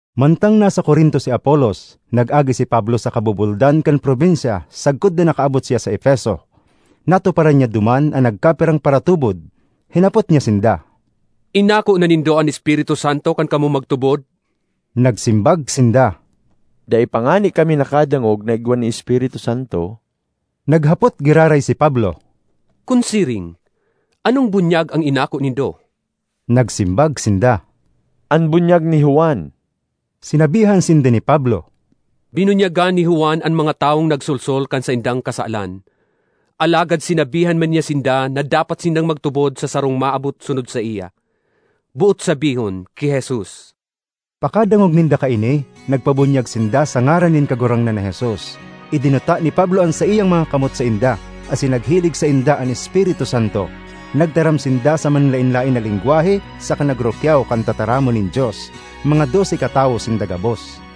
Mantang nasa Corinto si Apolos, nag-agi si Pablo sa kabubuldan kan probinsya sagkod na nakaabot siya sa Efeso. Natuparan niya duman an nagkapirang paratubod. Hinapot niya sinda, “Inako na nindo an Espiritu Santo kan kamo magtubod?” Nagsimbag sinda, “Dai pa ngani kami nakadangog na igwa nin Espiritu Santo.” Naghapot giraray si Pablo, “Kun siring, anong bunyag an inako nindo?” Nagsimbag sinda, “An bunyag ni Juan.” Sinabihan sinda ni Pablo, “Binunyagan ni Juan an mga tawong nagsolsol kan saindang kasalan; alagad sinabihan man niya sinda na dapat sindang magtubod sa sarong maabot sunod saiya, boot sabihon, ki Jesus.” Pakadangog ninda kaini, nagpabunyag sinda sa ngaran nin Kagurangnan na Jesus. Idinuta ni Pablo an saiyang mga kamot sainda, asin naghilig sainda an Espiritu Santo. Nagtaram sinda sa manlaen-laen na lengwahe saka nagrukyaw kan tataramon nin Dios. Mga dose katawo sinda gabos.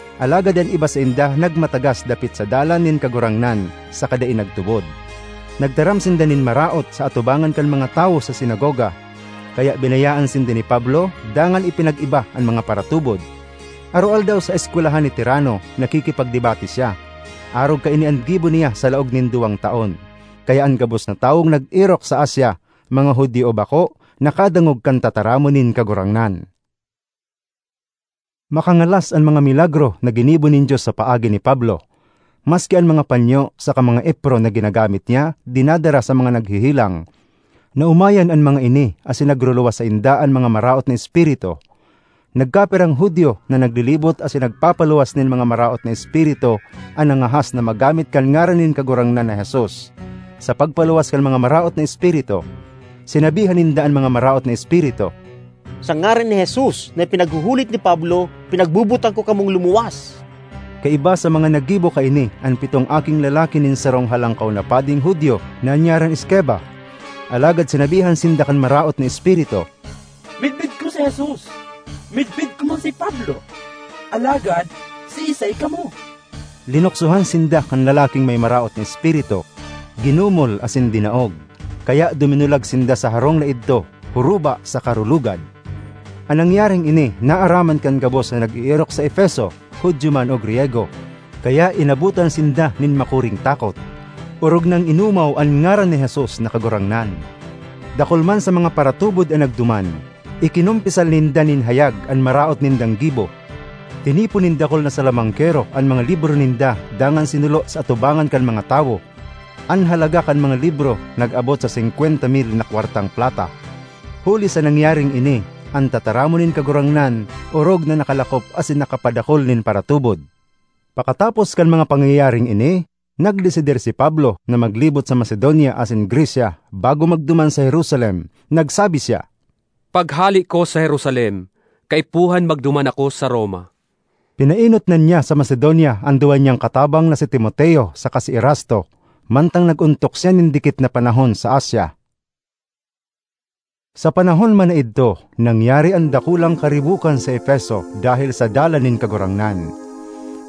Alagad an iba sainda nagmatagas dapit sa Dalan nin Kagurangnan saka dai nagtubod; nagtaram sinda nin maraot sa atubangan kan mga tawo sa sinagoga. Kaya binayaan sinda ni Pablo dangan ipinag-iba an mga paratubod. Aroaldaw sa eskwelahan ni Tiranno nakikipagdebate siya. Arog kaini an gibo niya sa laog nin duwang taon, kaya an gabos na tawong nag-erok sa Asia, mga Judio o bako, nakadangog kan tataramon nin Kagurangnan. Makangalas an mga milagro na ginibo nin Dios sa paagi ni Pablo. Maski an mga panyo saka mga epron na ginamit niya dinadara sa mga naghehelang. Naomayan an mga ini asin nagruluwas sainda an mga maraot na espiritu. Nagkapirang Judio na naglilibot asin nagpapaluwas nin mga maraot na espiritu an nangahas na maggamit kan ngaran nin Kagurangnan na Jesus sa pagpaluwas kan mga maraot na espiritu. Sinabihan ninda an mga maraot na espiritu, “Sa ngaran ni Jesus, na ipinaghuhulit ni Pablo, pinagbobotan ko kamong lumuwas.” Kaiba sa mga naggibo kaini an pitong aking lalaki nin sarong Halangkaw na Pading Judio na an ngaran Esceva. Alagad sinabihan sinda kan maraot na espiritu, “Midbid ko si Jesus, midbid ko man si Pablo; alagad siisay kamo?” Linuksohan sinda kan lalaking may maraot na espiritu, ginumol, asin dinaog. Kaya duminulag sinda sa harong na idto, huruba saka rulugad. An nangyaring ini naaraman kan gabos na nag-eerok sa Efeso, Judio man o Griyego; kaya inabotan sinda nin makuring takot. Orog nang inomaw an ngaran ni Jesus na Kagurangnan. Dakul man sa mga paratubod an nagduman; ikinumpisal ninda nin hayag an maraot nindang gibo. Tinipon nin dakul na salamangkero an mga libro ninda dangan sinulo sa atubangan kan mga tawo. An halaga kan mga libro nag-abot sa singkwenta mil na kwartang plata. Huli sa nangyaring ini, an tataramon nin Kagurangnan orog na nakalakop asin nakapadakul nin paratubod. Pakatapos kan mga pangyayaring ini, nagdesidir si Pablo na maglibot sa Macedonia asin Grecia bago magduman sa Jerusalem. Nagsabi siya, “Paghale ko sa Jerusalem kaipuhan magduman ako sa Roma.” Pinaenot na niya sa Macedonia an duwa niyang katabang na si Timoteo saka si Erasto, mantang nag-ontok siya nin dikit na panahon sa Asia. Sa panahon man na idto nangyari an dakulang karibokan sa Efeso dahel sa Dalan nin Kagurangnan.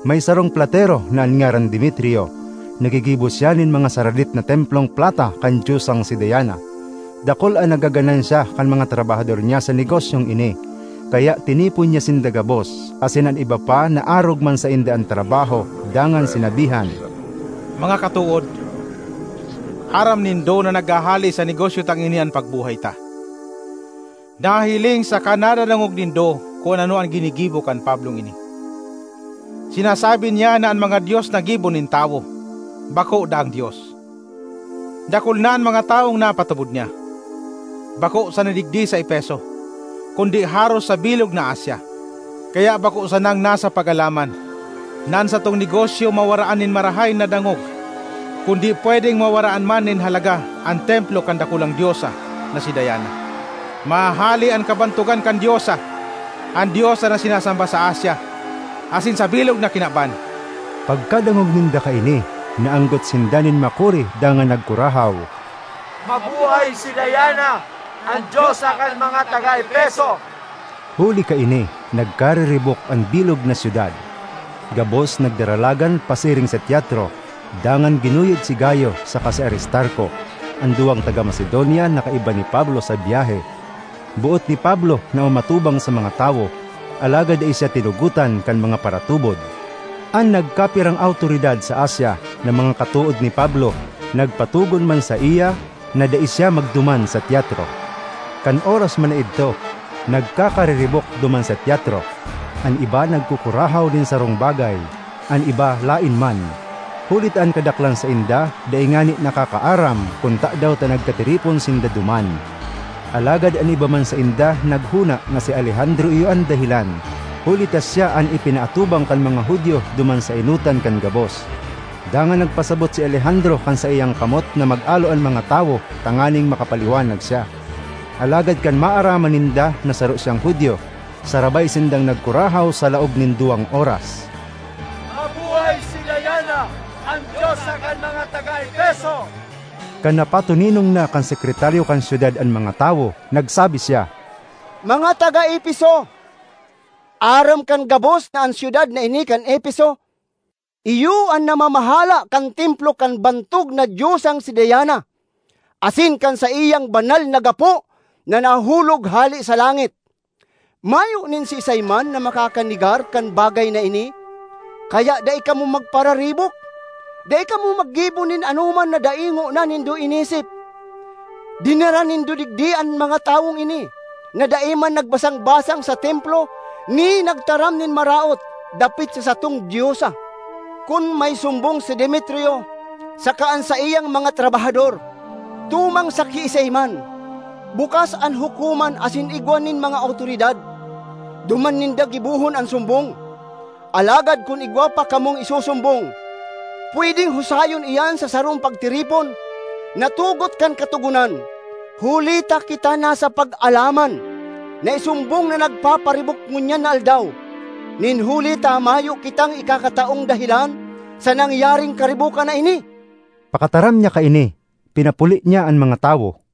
May sarong platero na an ngaran Demetrio. Naggigibo siya nin mga saradit na templong plata kan diosang si Diana. Dakul an nagaganansya kan mga trabahador niya sa negosyong ini. Kaya tinipon niya sinda gabos, asin an iba pa na arog man sainda an trabaho dangan sinabihan, “Mga katood, aram nindo na naghahale sa negosyo tang ini an pagbuhay ta. Nahihiling saka nadadangog nindo kun ano an ginigibo kan Pablong ini. Sinasabi niya na an mga dios na gibo nin tawo bako daang dios. Dakul na an mga tawong napatubod niya, bako sana digdi sa Efeso kundi haros sa bilog na Asia. Kaya bako sanang nasa pag-alaman na an satong negosyo mawaraan nin marahay na dangog, kundi pwedeng mawaraan man nin halaga an templo kan dakulang diosa na si Diana; mahahale an kabantogan kan diosa, an diosa na sinasamba sa Asia asin sa bilog na kinaban!” Pagkadangog ninda kaini, naanggot sinda nin makuri dangan nagkurahaw, “Mabuhay si Diana, an diosa kan mga taga Efeso!” Huli kaini nagkariribok an bilog na syudad; gabos nagdaralagan pasiring sa teatro, dangan ginuyod si Gayo saka si Aristarco, an duwang taga Macedonia na kaiba ni Pablo sa biyahe. Boot ni Pablo na umatubang sa mga tawo, alagad dai siya tinugotan kan mga paratubod. An nagkapirang awtoridad sa Asia, na mga katood ni Pablo, nagpatogon man saiya na dai siya magduman sa teatro. Kan oras man na idto, nagkakariribok duman sa teatro: an iba nagkukurahaw nin sarong bagay; an iba laen man, huli ta an kadaklan sainda dai ngani nakakaaram kun tadaw ta nagkatiripon sinda duman. Alagad an iba man sainda naghona na si Alejandro iyo an dahelan, huli ta siya an ipinaatubang kan mga Judio duman sa enotan kan gabos. Dangan nagpasabot si Alejandro kan saiyang kamot na mag-alo an mga tawo tanganing makapaliwanag siya. Alagad kan maaraman ninda na saro siyang Judio, sarabay sindang nagkurahaw sa laog nin duwang oras, “Mabuhay si Diana, an diosa kan mga taga Efeso!” Kan napatoninong na kan sekretaryo kan syudad an mga tawo, nagsabi siya, “Mga taga Efeso, aram kan gabos na an syudad na ini kan Efeso iyo an namamahala kan templo kan bantog na diosang si Diana asin kan saiyang banal na gapo na nahulog hale sa langit. Mayo nin siisay man na makakanegar kan bagay na ini. Kaya dai kamo magpararibok; dai kamo maggibo nin anoman na dai ngona nindo inisip. Dinara nindo digdi an mga tawong ini, na dai man nagbasang-basang sa templo ni nagtaram nin maraot dapit sa satong diosa. Kun may sumbong si Demetrio saka an saiyang mga trabahador tumang sa kiisay man, bukas an hukoman asin igwa nin mga awtoridad; duman ninda gibohon an sumbong. Alagad kun igwa pa kamong isusumbong, pwedeng husayon iyan sa sarong pagtiripon na tugot kan katogonan. Huli ta kita nasa pag-alaman na isumbong na nagpaparibok ngunyan na aldaw, nin huli ta mayo kitang ikakataong dahelan sa nangyaring karibokan na ini.” Pakataram niya kaini, pinapuli niya an mga tawo.